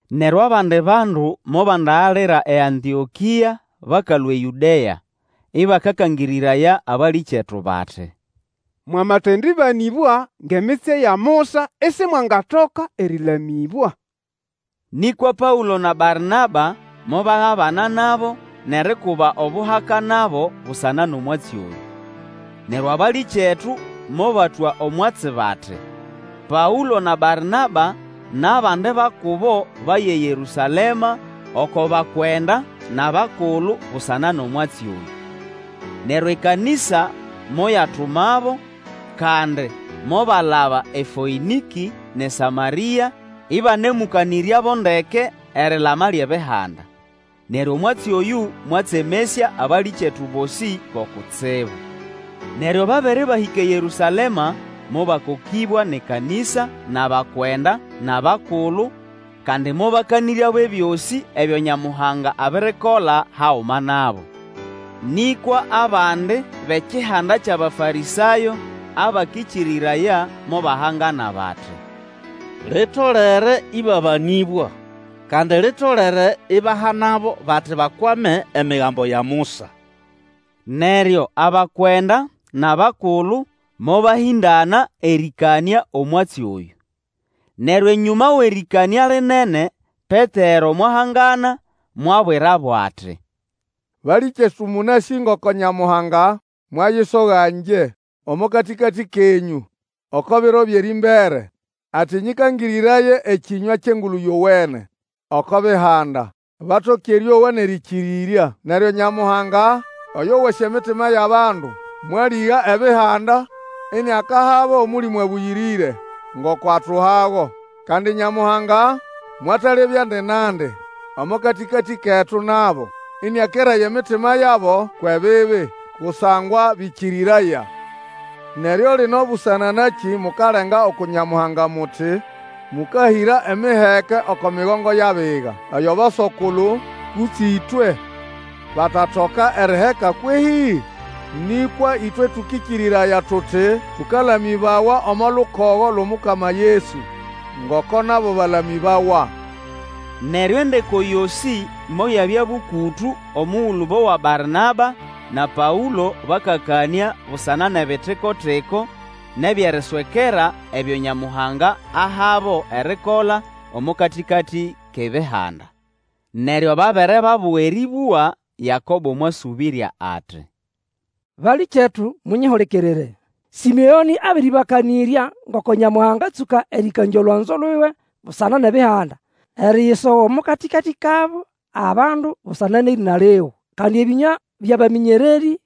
Neryo abandi bandu mobandagalira eAntĩokĩa bakalũa eYũdea, Ĩbakakangĩrĩraya abalĩkyetu bati, Mwamatendĩbanĩbwa ngʼemitsye ya Musa, isimwangatoka erĩlamĩbwa. Nĩkwa Paũlo na Barnaba mobagabana nabo nʼerikuba obuhaka nabo busana nʼomwatsi oyũ. Neryo abalĩkyetu mobatwa omwatsi bati, Paũlo na Barnaba nʼabandi ba kubo baye eYerũsalema oko bakwenda nʼabakulu busana nʼomwatsi oyũ. Neryo ekanĩsa moyatumabo, kandi mobalaba eFoĩnĩkĩ nʼeSamarĩa, ĩbanemũkanĩryabo ndeke erilama lyʼEbihanda. Neryo omwatsi oyũ mwatsemesya abalĩkyetu bosĩ bo kutsibu. Neryo babere bahĩka eYerũsalema mobakokĩbwa nʼekanĩsa nʼabakwenda nʼabakulu, kandi mobakanĩryabo ebyosĩ ebyo Nyamuhanga abirikola haguma nabo. Nĩkwa abandi bʼekihanda kyʼAbafarĩsayo abakĩkĩrĩraya, mobahangana bati, Litolere ĩbabanĩbwa, kandi litolere ibahanabo bati bakwame Emigambo ya Musa. Neryo abakwenda nʼabakulu mobahĩndana erĩkanĩa omwatsi oyũ. Neryo enyũma wʼerĩkanĩa lĩnene, Petero mwahangana, mwabwirabo ati, Balĩkyetu mũnasĩ ngoko Nyamuhanga mwayisoga ngye omo katĩkatĩ kenyũ oko biro byʼerĩmbere, ati nyĩkangĩrĩraye ekĩnywa kyʼEngulu Yowene oko Bihanda, batoke erĩowa nʼerĩkĩrĩrya. Neryo Nyamuhanga, oyo wasĩ emitima yʼabandu, mwalĩga Ebihanda iniakahabo Omũlĩmũ Abũyĩrĩre ngoko atuhago. Kandi Nyamuhanga mwatalebyandi nandi omo katĩkatĩ ketu nabo, ĩnĩakeraya emitima yabo kwʼebibi, kusangwa bĩkĩrĩraya. Neryo lino busana nakĩ mukalenga uku Nyamuhanga muti mũkahĩra emiheke oko migongo yʼabiga, eyo aboso-kulu kutse ĩtwe batatoka eriheka kwehĩ? Nĩkwa ĩtwe tũkĩkĩrĩraya tuti tũkalamĩbawa omo lukogo lwʼOmukama Yesu, ngoko nabo bakalamĩbawa. Neryo endeko yosĩ moyabya bũkũtũ omugulu bowa Barnaba na Paũlo bakakanĩa busana nʼebitiko-tiko nʼebyʼeriswekera ebyo Nyamuhanga ahabo erikola omo katĩkatĩ kʼEbihanda. Neryo babe re babuga erĩbũga, Yakobo mwasũbĩrya ati, Balĩkyetu, munyihulikirire! Sĩmeonĩ abĩrĩbakanĩrya ngoko Nyamuhanga atsũka erĩkangya olwanzo luwe busana nʼEbihanda, eriyisoga omo katĩkatĩ kabo abandu busana nʼerĩna liwe. Kandi ebĩnywa byʼabamĩnyererĩ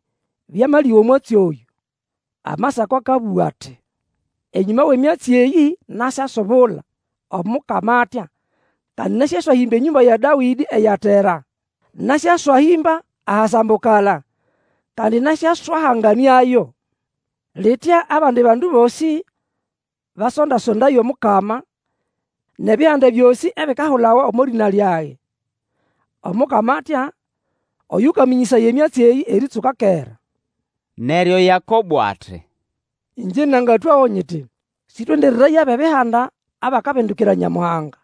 byamalĩga omwatsi oyũ. Amasako akabũga ati, Enyũma wʼemyatsi eyĩ nasyasubula, Omukama atya, Kandi nasyaswahĩmba enyũmba ya Dawĩdĩ eyatera, Nasyaswahĩmba ahasambukala, Kandi nasyaswahanganĩayo. Litya abandi bandu bosĩ basondaso-ndaye Omukama, NʼEbihanda byosĩ ebikahulawa omo lĩna lyage. Omukama atya, oyũkamĩnyĩsaya emyatsi eyĩ erĩtsũka kera. Neryo Yakabo ati, Ĩngye nangatwago nyiti, Sĩtwendereraye abʼEbihanda abakabindukira Nyamuhanga.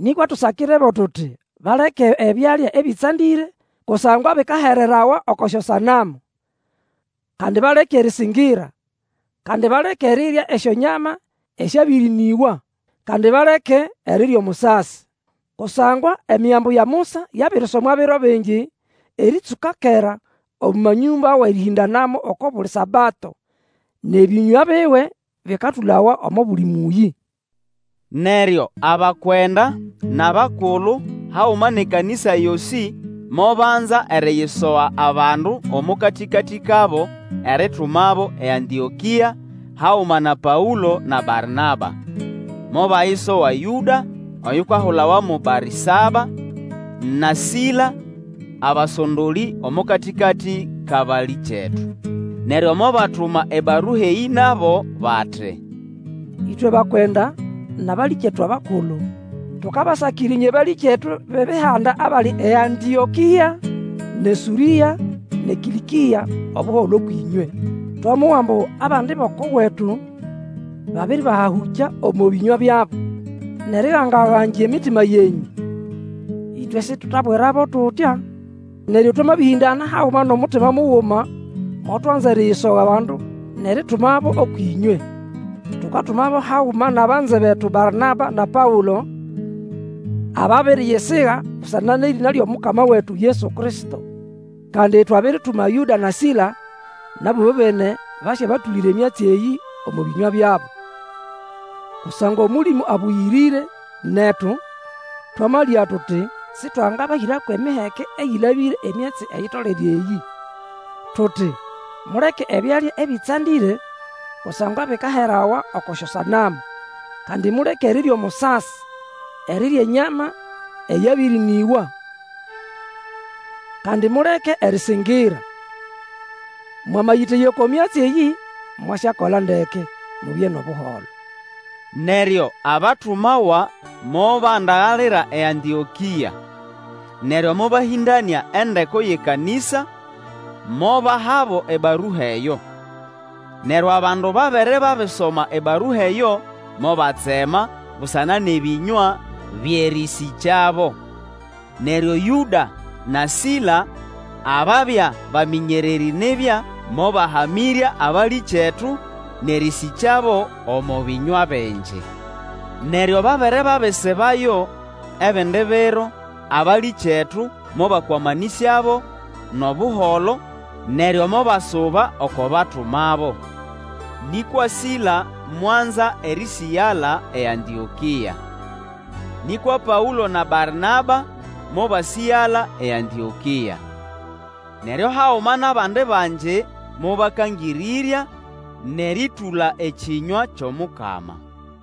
Nĩkwa tusakirebo tuti, baleke ebyalya ebĩtsandĩre kusangwa bikaherawa oko syosanamu, kandi baleke erĩsĩngĩra, kandi baleke erirya esyonyama esyabĩrĩnĩgwa, kandi baleke, erirya omusasi. Kusangwa Emigambo ya Musa yabirisomwa biro bingi erĩtsũka kera omo manyũmba wʼerĩhĩndanamo oko buli Sabato, nʼebĩnywa biwe bĩkatũlawa omo buli mũyĩ. Neryo abakwenda nʼabakulu, haguma nʼekanĩsa yosĩ mobanza eriyisoga abandu omo katĩkatĩ kabo eritumabo eAntĩokĩa haguma na Paũlo na Barnaba. Mobayisoga Yũda oyukahulawa mo Barĩsaba, na Sila, abasondolĩ omo katĩkatĩ kʼabalĩkyetu. Neryo mobatuma ebarua eyĩ nabo, bati, Ĩtwe bakwenda, nʼabalĩkyetu abakulu, tukabasakira ĩnywe balĩkyetu bʼEbihanda abali eAntĩokĩa, nʼeSũrĩa, nʼeKĩlĩkĩa, Obuholo ũkwʼĩnywe. Twamowa ambu abandi bʼoko wetu babiribahahũkya omo bĩnywa byabo, nʼeriganga-gangya emitima yenyũ. Ĩtwe sitwetabwirabo tutya. Neryo twamabĩhĩndana haguma nʼomutima muguma, motwanza eriyisoga bandu nʼeritumabo ũkwʼĩnywe. Tukatumabo haguma nʼabanze betu Barnaba na Paũlo, ababiriyisiga busana nʼerĩna lyʼomukama wetu Yesu Kristo. Kandi twabirituma Yũda na Sila, nabo ĩbobene basyabatũlĩra emyatsi eyĩ omo bĩnywa byabo. Kusangwa Omũlĩmũ Abũyĩrĩre, netu, twamalĩga tuti sĩtwangabahĩra kwʼemiheke eyĩlabĩre emyatsi eyitolere eyĩ: tuti, muleke ebyalya ebĩtsandĩre kusangwa bikaherawa oko syosanamu; kandi muleke erirya omusasi; erirya enyama eyabĩrĩnĩgwa; kandi muleke erĩsĩngĩra. Mwamayĩteya oko myatsi eyĩ, mwasyakola ndeke. Mubye nʼobuholo. Neryo abatumawa mobandagalira eAntĩokĩa. Neryo mobahĩndanĩa endeko yʼekanĩsa, mobahabo ebarua eyo. Neryo abandu babere babisoma ebarua eyo, mobatsema busana nʼebĩnywa byʼerĩsĩkyabo. Neryo Yũda na Sila, ababya bamĩnyererĩ nibya, mobahamĩrya abalĩkyetu, nʼerĩsĩkyabo omo bĩnywa bingi. Neryo babere babisibayo ebindi biro, abalĩkyetu mobakwamanĩsyabo nʼobuholo, neryo mobasuba oko batumabo. [ Nĩkwa Sila mwanza erĩsĩgala eAntĩokĩa.] Nĩkwa Paũlo na Barnaba mobasĩgala eAntĩokĩa. Neryo haguma nʼabandi bangi mobakangĩrĩrya, nʼerĩtũla ekĩnywa kyʼomukama.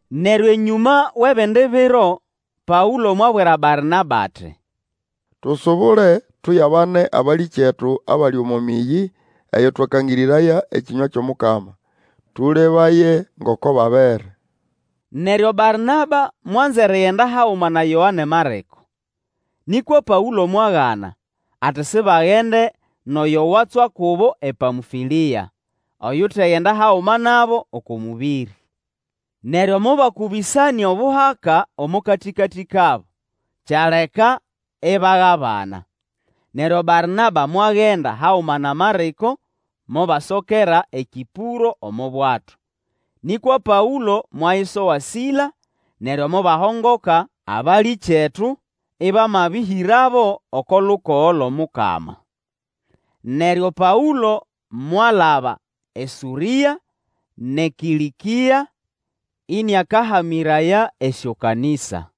Neryo enyũma wʼebindi biro, Paũlo mwabwira Barnaba ati, Tusubule tuyabane abalĩkyetu abali omo mĩyĩ eyo twakangĩrĩraya ekĩnywa kyʼomukama, tũlebaye ngoko babere. Neryo Barnaba mwanza erigenda haguma na Yoane Marĩko. Nĩkwa Paũlo mwagana, ati sibagende nʼoyo watswa kubo ePamfĩlĩa, oyutagenda haguma nabo oko mũbĩrĩ. Neryo mobakũbĩsananĩa obuhaka omo katĩkatĩ kabo, kyaleka ibagabana. Neryo Barnaba mwagenda haguma na Marĩko mobasokera eKĩpũro omo bwato. Nĩkwa Paũlo mwayisoga Sila, neryo mobahongoka, abalĩkyetu ĩbamabĩhĩrabo oko lukogo lwʼOmukama. Neryo Paũlo mwalaba eSũrĩa nʼeKĩlĩkĩa, ĩnĩakahamĩraya esyokanĩsa.